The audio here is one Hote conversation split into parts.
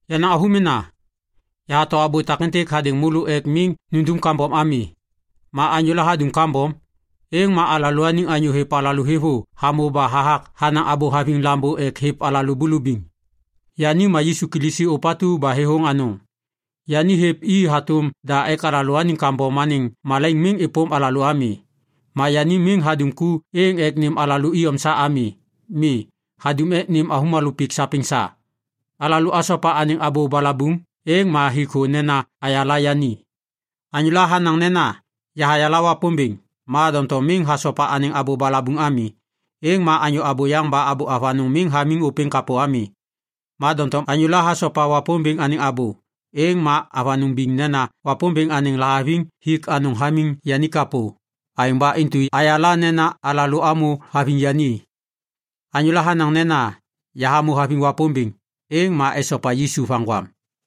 Yenaŋ avômena, yahato abô takêntêk hadêŋ môlô ek miŋ nundum kambom ami. Ma anyôla hadum kambom, êŋ ma alalôaniŋ anyô hêv alalô thêvô hamô ba hathak hanaŋ abô haviŋ Lambô ek hêv alalô bulubiŋ. Yani ma Yisu Kilisi ôpatu ba thêthôŋ anôŋ. Yani hêv i hatôm da ek alalôaniŋ kambom anêŋ malaiŋ miŋ êpôm alalô ami. Ma yani miŋ hadum ku êŋ ek nêm alalô iyom sa ami. Mi, hadum ek nêm avômalô pik sapêŋ sa. Alalô asopa anêŋ abô balabuŋ, êŋ ma hik thô nena ayala yani. Anyôla hanaŋ nena, “Yahayala Wapômbêŋ” ma doŋtom miŋ hasopa anêŋ abô balabuŋ ami, êŋ ma anyô abôyaŋ ba abô avanôŋ miŋ hamiŋ ôpêŋ kapô ami. Ma doŋtom anyôla hasopa Wapômbêŋ anêŋ abô, êŋ ma avanôŋ biŋ nena Wapômbêŋ anêŋ lahaviŋ hik anôŋ hamiŋ yani kapô. Aêŋ ba intu ayala nena alalô amô haviŋ yani. Anyôla hanaŋ nena, “Yahamô haviŋ Wapômbêŋ”, êŋ ma esopa Yisu vaŋgwam.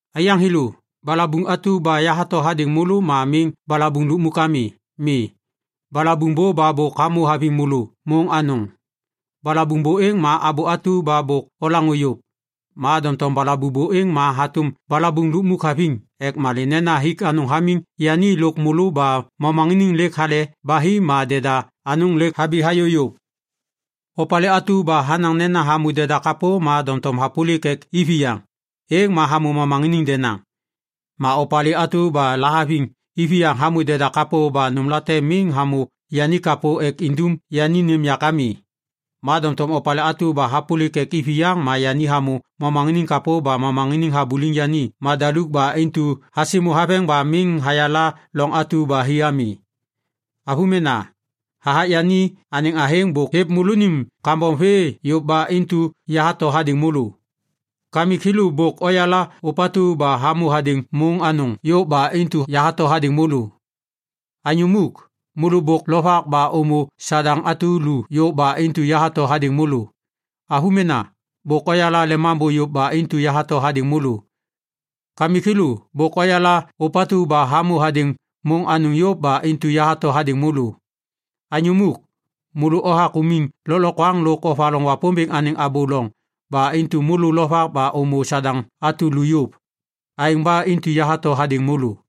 Aiyaŋ thêlô, balabuŋ atu ba yahato hadêŋ môlô ma miŋ balabuŋ lukmuk ami. Mi, balabuŋ bô ba bôk hamô haviŋ môlô môŋ anôŋ. Balabuŋ bô êŋ ma abô atu ba bôk olaŋô yôv. Ma doŋtom balabuŋ bô êŋ ma hatôm balabuŋ lukmuk haviŋ ek malê nena hik anôŋ hamiŋ yani lôk môlô ba momaŋiniŋ lêk hale ba hi ma deda anôŋ lêk habi hayô yôv. Opalê atu ba hanaŋ nena hamô deda kapô ma doŋtom hapôlik ek iviyaŋ, êŋ ma hamô momaŋiniŋ denaŋ. Ma opalê atu ba lahaviŋ iviyaŋ hamô deda kapô ba nômlate miŋ hamô yani kapô ek indum yani nêm yak ami. Ma doŋtom opalê atu ba hapôlik ek iviyaŋ ma yani hamô momaŋiniŋ kapô ba momaŋiniŋ habuliŋ yani madaluk ba intu hasimô haveŋ ba miŋ hayala loŋ atu ba hi ami. Avômena, hathak yani anêŋ athêŋ bôk hêv môlônim kambom vê yôv ba intu yahato hadêŋ môlô. Kamik thêlô, bôk oyala ôpatu ba hamô hadêŋ môŋ anôŋ yôv ba intu yahato hadêŋ môlô. Anyô muk, môlô bôk lovak ba ômô Sadaŋ atu lu yôv ba intu yahato hadêŋ môlô. Avômena, bôk oyala Lemambô yôv ba intu yahato hadêŋ môlô. Kamik thêlô, bôk oyala ôpatu ba hamô hadêŋ môŋ anôŋ yôv ba intu yahato hadêŋ môlô. Anyô muk, môlô othak umiŋ lôklokwaŋ lôk ovaloŋ Wapômbêŋ anêŋ abô loŋ ba intu lovak ba ômô Sadaŋ atu lu yôv. Aêŋ ba intu yahato hadêŋ môlô.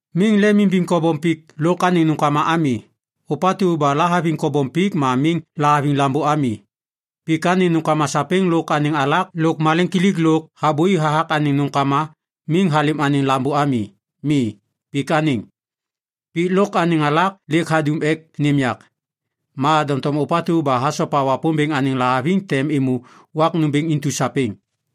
Miŋ lemimbiŋ kobom pik lôk anêŋ nômkama ami. Ôpatu ba lahaviŋ kobom pik ma miŋ lahaviŋ Lambô ami. Pik anêŋ nômkama sapêŋ lôk anêŋ alak lôk maleŋkilik lôk habôi hathak anêŋ nômkama miŋ halêm anêŋ Lambô ami. Mi, pik anêŋ. Pik lôk anêŋ alak lêk hadum ek nêm yak, ma doŋtom ôpatu ba hasopa Wapômbêŋ anêŋ lahaviŋ tem êmô wak nômbêŋ intu sapêŋ.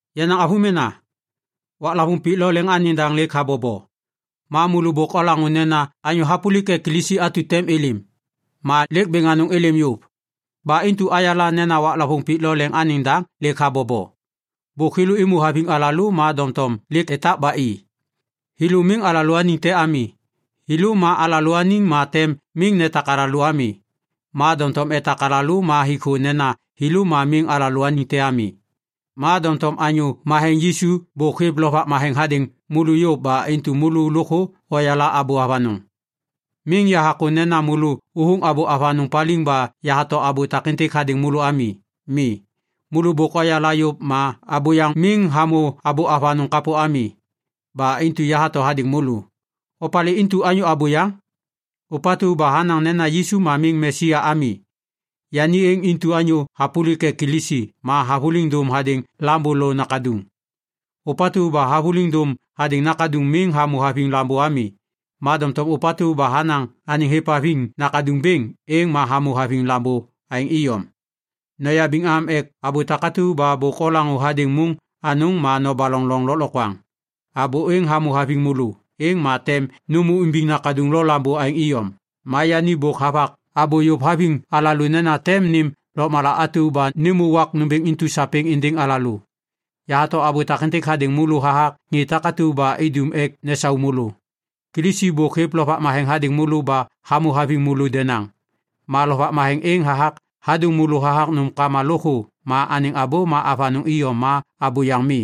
Yenaŋ avômena, waklavôŋ pik lo leŋ anêŋ daŋ lêk habobo. Ma môlô bôk olaŋô nena anyô hapôlik ek Kilisi atu tem êlêm. Ma lêk bêŋ anôŋ êlêm yôv. Ba intu ayala nena waklavôŋ pik lo leŋ anêŋ daŋ lêk habobo. Bôk thêlô êmô haviŋ alalô ma doŋtom lêk etak ba i. Thêlô miŋ alalôaniŋ te ami. Thêlô ma alalôaniŋ ma tem miŋ netak alalô ami. Ma doŋtom etak alalô ma hik thô nena thêlô ma miŋ alalôaniŋ te ami. Ma doŋtom Anyô Matheŋ Yisu bôk hêv Lovak Matheŋ hadêŋ môlô yôv ba intu môlô lôkthô oyala abô avanôŋ. Miŋ yahakô nena môlô ôthôŋ abô avanôŋ paliŋ ba yahato abô takêntêk hadêŋ môlô ami. Mi, môlô bôk oyala yôv ma abôyaŋ miŋ hamô abô avanôŋ kapô ami. Ba intu yahato hadêŋ môlô. Opalê intu anyô abôyaŋ? Ôpatu ba hanaŋ nena Yisu ma miŋ Mesaya ami. Yani êŋ intu anyô hapôlik ek Kilisi ma havôliŋ dôm hadêŋ Lambô lo Nakaduŋ. Ôpatu ba havôliŋ dôm hadêŋ Nakaduŋ miŋ hamô haviŋ Lambô ami. Ma doŋtom ôpatu ba hanaŋ anêŋ hêvhaviŋ Nakaduŋ bêŋ, êŋ ma hamô haviŋ Lambô aêŋ iyom. Noyabiŋ am ek abô takatu ba bôk olaŋô hadêŋ môŋ anôŋ ma nobaloŋ loŋ lôklokwaŋ. Abô êŋ hamô haviŋ môlô, êŋ ma tem nômô imbiŋ Nakaduŋ lo Lambô aêŋ iyom. Ma yani bôk havak abô yôv haviŋ alalô nena tem nêm lôkmala atu ba nêmô wak nômbêŋ intu sapêŋ êndêŋ alalô. Yahato abô takêntêk hadêŋ môlô hathak ŋê takatu ba idum ek nesau môlô. Kilisi bôk hêv Lovak Matheŋ hadêŋ môlô ba hamô haviŋ môlô denaŋ. Ma Lovak Matheŋ êŋ hathak hadôŋ môlô hathak nômkama lôkthô ma anêŋ abô ma avanôŋ iyom ma abôyaŋ mi.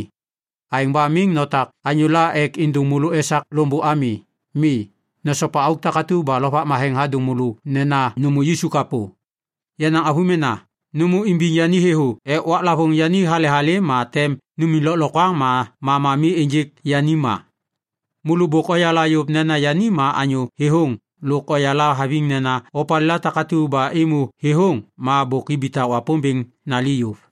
Aêŋ ba miŋ notak anyôla ek êndôŋ môlô esak loŋbô ami. Mi, nosopa auk takatu ba Lovak Matheŋ hadôŋ môlô nena nômô Yisu kapô. Yenaŋ avômena, nômô imbiŋ yani thêthô ek waklavôŋ yani hale halêm ma tem numiŋ lôklokwaŋ ma mama mi ênjêk yani ma. Môlô bôk oyala yôv nena yani ma anyô thêthôŋ lôk oyala haviŋ nena opalêla takatu ba êmô thêthôŋ ma bôk ibitak Wapômbêŋ nali yôv.